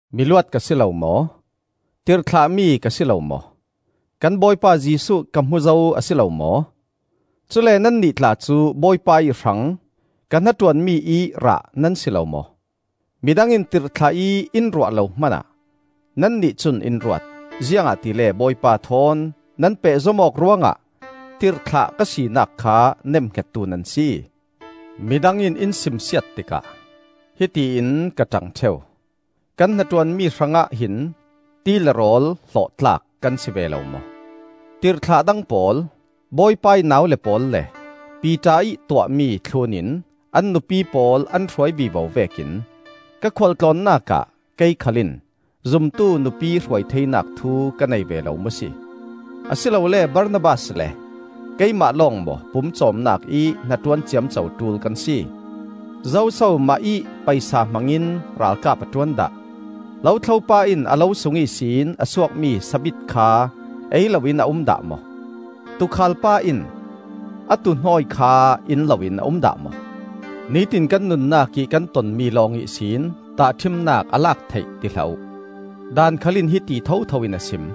Miluat ka si lo maw? Tirhthlahmi ka si lo maw? Kan Bawipa Jesuh ka hmu zo a si lo maw? Cule nannih tla cu Bawipa ih hrang ka hnaṭuanmi ih rah nan si lo maw? Midang in tirhthlah ih in ruah lo hmanah nannih cun in ruat, ziangahtile Bawipa thawn nan pehzom awk ruangah tirhthlah ka sinak kha nemhngettu nan si. Midang in in simsiat tikah hiti in ka ṭang ṭheu: Kan hnaṭuanmi hrangah hin ti le rawl hlawh tlak kan si ve lo maw? Tirhthlah dang pawl, Bawipa ih naule pawl le Piter ih tuahmi thlunin an nupi pawl an hruai vivo vekin ka khualtlawnnak ah kei khal in zumtu nupi hruai theinak thu ka nei ve lo maw si? Asilole Barnabas le keimah lawng maw pumcawmnak ih hnaṭuan ciamco ṭul kan si? Zoso mahih paisa hmangin ralkap a ṭuan dah? Lothlo pa in a lo sung ihsin a suakmi sabit kha ei loin a um dah maw? Tuukhal pa in a tuuhnawi kha in loin a um dah maw? Nitin kan nunnak ih kan tonmi lawng ihsin tahṭhimnak a lak theih ti hlah uh. Daan khal in hiti thotho in a sim.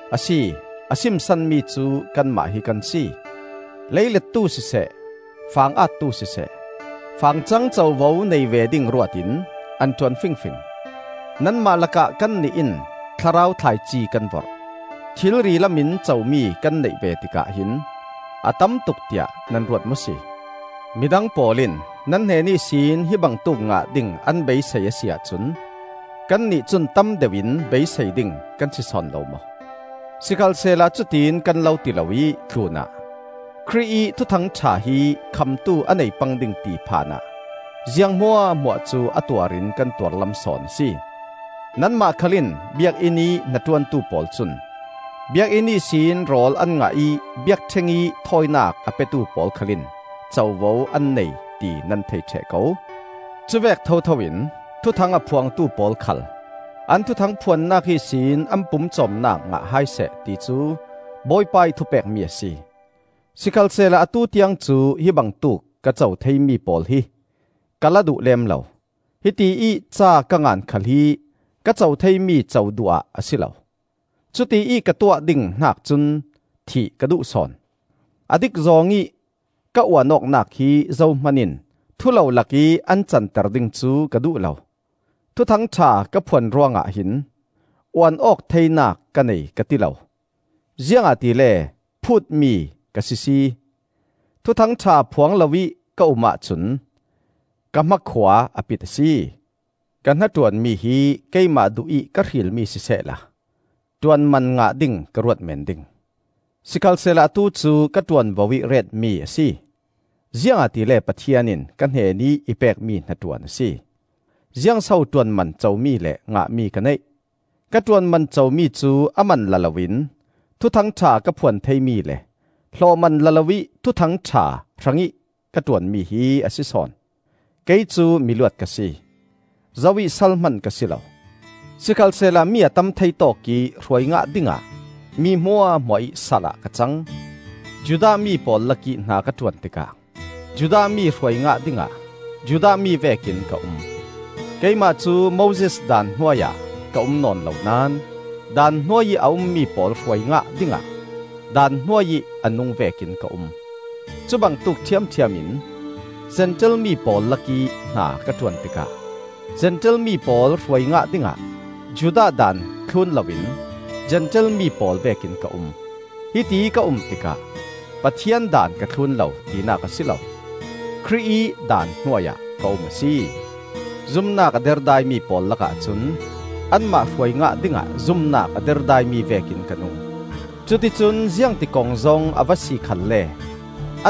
Asi, a sim sanmi cu kanmah hi kan si. Lei lettu siseh, fang attu siseh, fangcang covo nei ve ding ruatin an ṭuan fingfing. Nanmah lakah kannih in thlarau thlaici kan vorh. Thilri lamin comi kan neih ve tikah hin a tamtuk tiah nan ruat maw si? Midang pawl in nan hnen ihsin hibangtuk ngah ding an beisei a si ahcun kannih cun tam deuh in beisei ding kan si sawn lo maw? Sikhalsehla cutiin kan lo ti loih tlunah Khrih ih Thuthang ṭha hi khamtu a nei pang ding ti phan ah ziang hmuahhmuah cu a tuarin kan tuar lam sawn a si. Nanmah khal in Biakinn ih hnaṭuantu pawl cun Biakinn ihsin rawl an ngah ih biakṭheng ih thawinak a petu pawl khal in covo an nei, ti nan thei ṭheh ko. Cuvek thotho in thuthang a phuangtu pawl khal an thuthang phuannak ihsin an pumcawmnak ngah hai seh, ti cu Bawipa ih thupekmi a si. Sikhalsehla atu tiang cu hibangtuk ka co theimi pawl hi ka la duh lem lo; hiti ih ca ka ngan khal hi ka co theimi co duh ah a si lo. Cutiih ka tuah ding hnak cun thih ka duh sawn. A dik zawng ih ka uan awknak hi zohman in thulolak ih an canter ding cu ka duh lo. Thuthang ṭha ka phuan ruangah hin uan awk theinak ka nei ka ti lo. Ziangahtile phuutmi ka sisi! Thuthang ṭha phuang loih ka um ahcun ka hmakhua a pit a si. Ka hnaṭuanmi hi keimah duhih ka hrilmi sisehla ṭuanman ngah ding ka ruat meen ding; sikhalsehla atu cu ka ṭuanvo ih retmi a si, ziangahtile Pathian in ka hnenih i pekmi hnaṭuan a si. Ziang so ṭuanman comi le ngahmi ka neih? Ka ṭuanman comi cu a man la loin Thuthang ṭha ka phuan theimi le hlawhman la loih Thuthang ṭha hrangih ka ṭuanmi hi a si sawn. Kei cu miluat ka si; zo ih sal hman ka si lo. Sikhalsehla mi a tam thei tawkih hruai ngah dingah mi hmuahhmuah ih sal ah ka cang. Judah mi pawl lakih hna ka ṭuan tikah Judah mi hruai ngah dingah Judah mi vekin ka um; keimah cu Moses Daan hnuai ah ka um nawn lo naón Daan hnuai ih a ummi pawl hruai ngah dingah Daan hnuai ih a nung vekin ka um. Cubangtuk ṭhiamṭhiam in Zentail mi pawl lakih hna ka ṭuan tikah Zentail mi pawl hruai ngah dingah Judah Daan thlun loin Zentail mi pawl vekin ka um. Hitiih ka um tikah Pathian daan ka thlun lo, tinak a si lo; Khrih ih daan hnuai ah ka um a si. Zumnak a derdaimi pawl lakah cun anmah hruai ngah dingah zumnak a derdaimi vekin ka nung. Cuticun ziangti kongzawng a va si khalle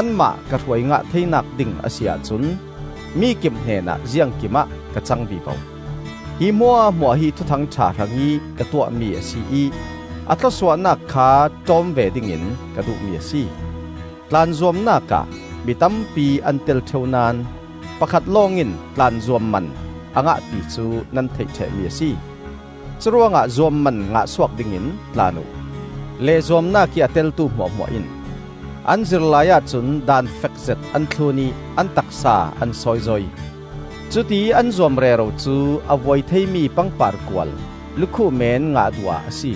anmah ka hruai ngah theinak ding a si ahcun mikip hnenah ziangkim ah ka cang vivo. Hi hmuahhmuah hi Thuthang ṭha hrangih ka tuahmi a si ih a thlawsuahnak kha ṭawm ve dingin ka duhmi a si. Tlan zuamnak ah mi tampi an tel ṭheu naón pakhat lawngin tlan zuamman a ngah ti cu nan theih ṭhehmi a si. Curuangah zuamman ngah suak dingin tlan uh. Leh zuamnak ih a teltu hmuahhmuah in an zir laiah cun daan fekzet an thlun ih an taksa an sawizoi. Cutiih an zuam rero cu a vuai theimi pangpar kual lukhuh men ngah duh ah a si.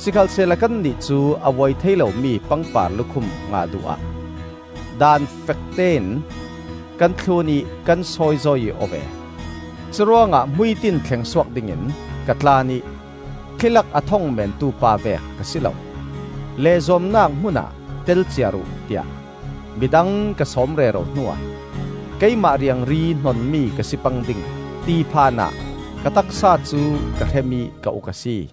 Sikhalsehla kannih cu a vuai thei lomi pangpar lukhum ngah duh ah daan fektein kan thlun ih kan sawizoi aw ve. Curuangah hmuitin thleng suak dingin ka tlan ih thli lak a thong meentu pa vek ka si lo. Leh zuamnak hmunah tel ciar uh tiah midang ka sawm rero hnuah keimah riangri hnonmi ka si pang ding, ti phan ah ka taksa cu ka hrem ih ka uk a si.